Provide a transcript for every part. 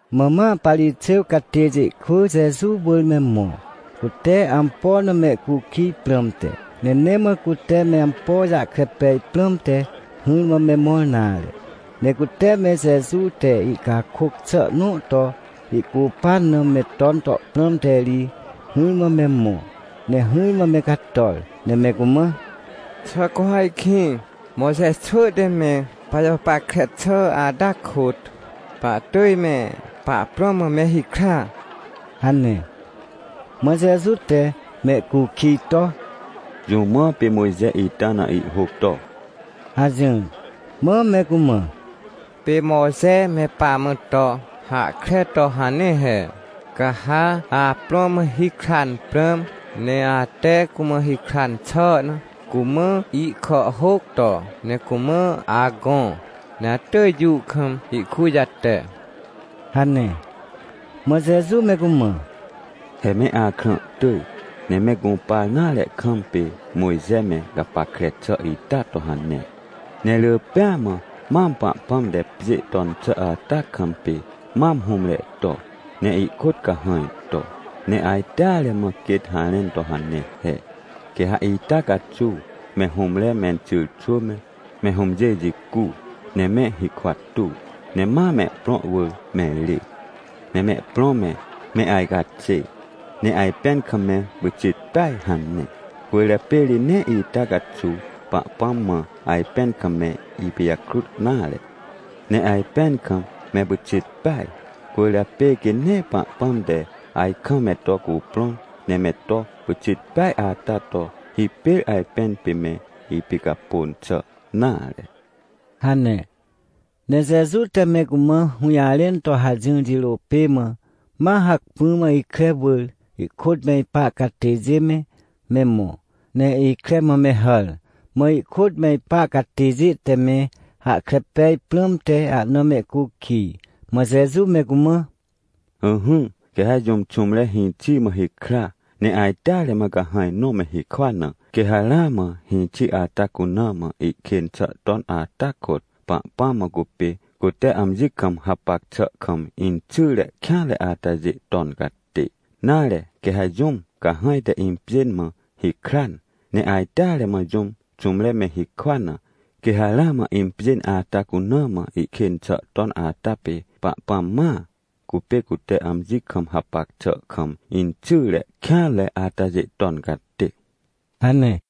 Mã ma Parixêw catêjê kwỳ Jeju wỳr me mõ, cute ampo na mehcukij prãmte. Ne nee mã cute me ampo jahkre pej prãmte hỹrmã me mõr nare, ne cute me Jeju te ihcakôc xà nõ to ihcupan na me ton to prãmte ri, hỹrmã me mõ. Ne hỹrmã me cator, ne me cumã: — Xà cu ha ajkĩ Mojxe xwỳ te me pajapackre xà ata kôt, pahtỳj me pahprõ mã me hikra? — hane. Mã Jeju te mehcukij to: — Jũ mã pê Mojxe ita na ihhôc to? — hajỹr. Mã me cumã: — Pê Mojxe me pamã to hahkre to hane he: “Ca ha aprõ mã hikran prãm, ne ate cumã hikran xà na cumã ihkàhhôc to, ne cumã agõ, ne atỳj jũ kam ihkujate” — hane. Mã Jeju me cumã: — He me akrã tỳj, ne me gũpar nare kam pê Mojxe me gapackre xà ita to hane. Ne rỳ pêa mã, mam Pahpãm te pjê ton xà ata kam, pê mam hũmre to ne ihkôt cahãj to, ne ajteare mã quêt harẽn to hane he: “Quê ha ita caxuw me hũmre menxyrxwỳ me, me hũmjê jicu, ne me hikwa tuw, ne ma mehprõ wỳr me rê, ne mehprõ me, me ajcaxê, ne ajpẽn kam me pyxit peaj” hane. Cwỳrjapê ri nee ita caxuw Pahpãm mã ajpẽn kam me ipijakrut nare, ne ajpẽn kam me pyxit peaj. Cwỳrjapê quê nee Pahpãm te ajkam me to cuprõn ne me to pyxit peaj ata to, hipêr ajpẽn pê me ipicapôn xà nare — hane. Ne Jeju te me cumã hũjarẽn to hajỹr jirô pê mã, ma hacpỹ mã ikre wỳr, ihkôt me ipa catêjê me, me mõ. Ne ikre mã me hàr, mã ihkôt me ipa catêjê te me hahkre pej prãmte ahna mehcukij. Mã Jeju me cumã: — Ỹhỹ, quê ha jũm xũmre hĩxi mã hikra, ne ajteare mã cahãj nõ me hikwa na, quê ha ramã hĩxi ata cuna mã ihkên xà ton ata kôt, Pahpãm mã cupê cute amji kam hapac xà kam inxyre kêanre atajê ton catê. Nare quê ha jũm cahãj te impjên mã hikran, ne ajteare mã jũm xũmre me hikwa na, quê ha ramã impjên ata cuna mã ihkên xà ton ata pê Pahpãm mãa, cupê cute amji kam hapac xà kam inxyre kêanre atajê ton catê — hane.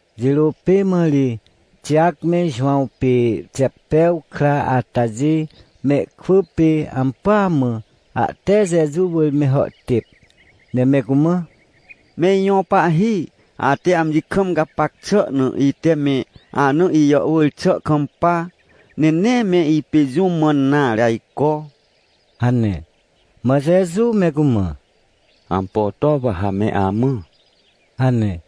Jirô pê mã ri Tijac me Jowãw pê Xeptew kra atajê mehkwỳ pê ampỳa mã, ahte Jeju wỳr me hàhtêp, ne me cumã: — Me ijõ Pahhi, ate amji kam gapac xà na, ite me ana ijàhwỳr xà kampa, ne nee me ipê jũ mãn nare ajco — hane. Mã Jeju me cumã: — Ampo to wa ha me amã? — hane.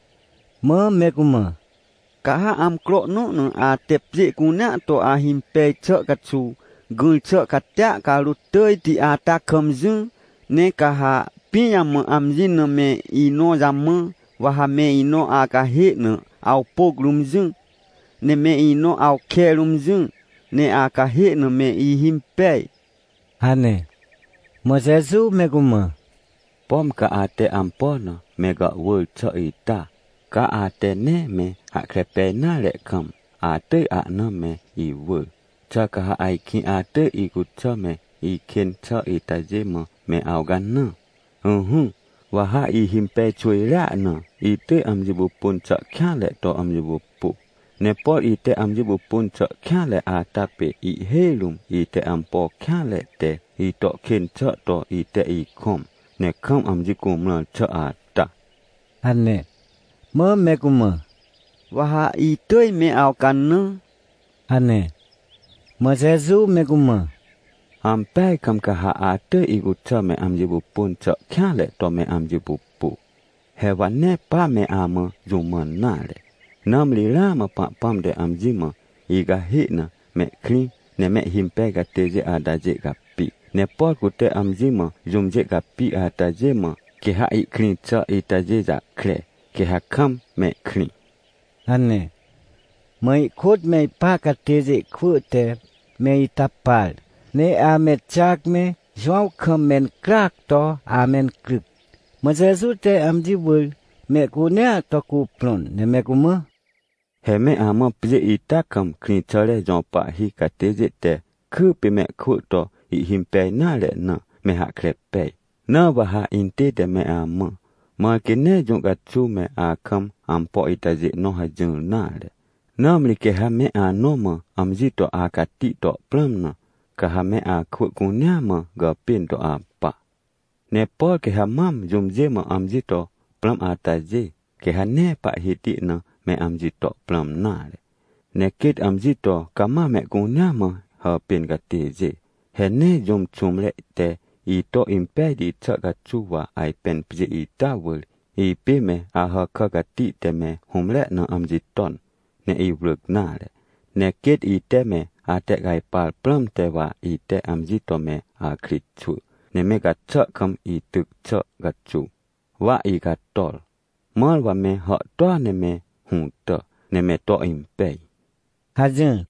Mã me cumã: — Ca ha amcro nõ na ate pjê cunea to ahimpej xà caxuw gỹr xà catia carôt tỳjti ata kam jỹ, ne ca ha pijamã amji na me inõ jamã, wa ha me inõ acahê na awpôc rũm jỹ, ne me inõ awke rũm jỹ, ne acahê na me ihimpej! — hane. Mã Jeju me cumã: — Pom ca ate ampo na me gàhwỳr xà ita, ca ate nee me hahkre pej nare kam, atỳj ahna me iwỳr. Xà ca ha ajkĩ atỳj icuxà me ikên xà itajê mã me awcanã? Ỹhỹ, wa ha ihimpej xwỳjrea na itỳj amji pupun xà kêanre to amji pupu. Ne por ite amji pupun xà kêanre ata pê ihhêj rũm ite ampo kêanre te ito kên xà to ite ikõm, ne kam amji cumrãr xà ata — hane. Mã me cumã: — Wa ha itỳj me awcanã — hane. Mã Jeju me cumã: — Ampeaj kam ca ha atỳj icuxà me amji pupun xà kêanre to me amji pupu. He wa nee pa me amã jũ mãn nare, nãmri ramã Pahpãm te amji mã icahê na mehkrĩ ne mehhimpej catêjê atajê capi, ne por cute amji mã jũmjê capi atajê mã quê ha ihkrĩ xà itajê jahkre, quê ha kam mehkrĩ — hane. Mã ihkôt me ipa catêjê kwỳ te me ita par, ne ame Tijac me Jowãw kam mencryac to amencryc. Mã Jeju te amji wỳr mehcunea to cuprõn ne me cumã: — He me amã pjê ita kam krĩxàre jõ pahhi catêjê te kypê mehkwỳ to ihhimpej nare na, me hahkre pej. Na wa ha intête me amã, mãr quê nee jũ caxuw me akam ampo itajê nõ hajỹr nare. Nãmri quê ha me anõ mã amji to acati to prãm na, ca ha me akwỳ cunea mã gàpên to apa. Ne por quê ha mam jũmjê mã amji to prãm atajê, quê ha nee pahhiti na me amji to prãm nare, ne quêt amji to cama mehcunea mã hàpên catêjê. — He nee jũm xũmre te ito impejti xà caxuw wa ajpên pjê ita wỳr, ipê me Ahàkà cati te me hũmre na amji ton, ne iwrỳc nare. Ne quêt ite me atehcajpar prãmte wa ite amji to me akritxwỳ, ne me gaxà kam ityc xà caxuw, wa icator, mãr wa me hàhtôa ne me hũtà ne me to impej — hajỹr.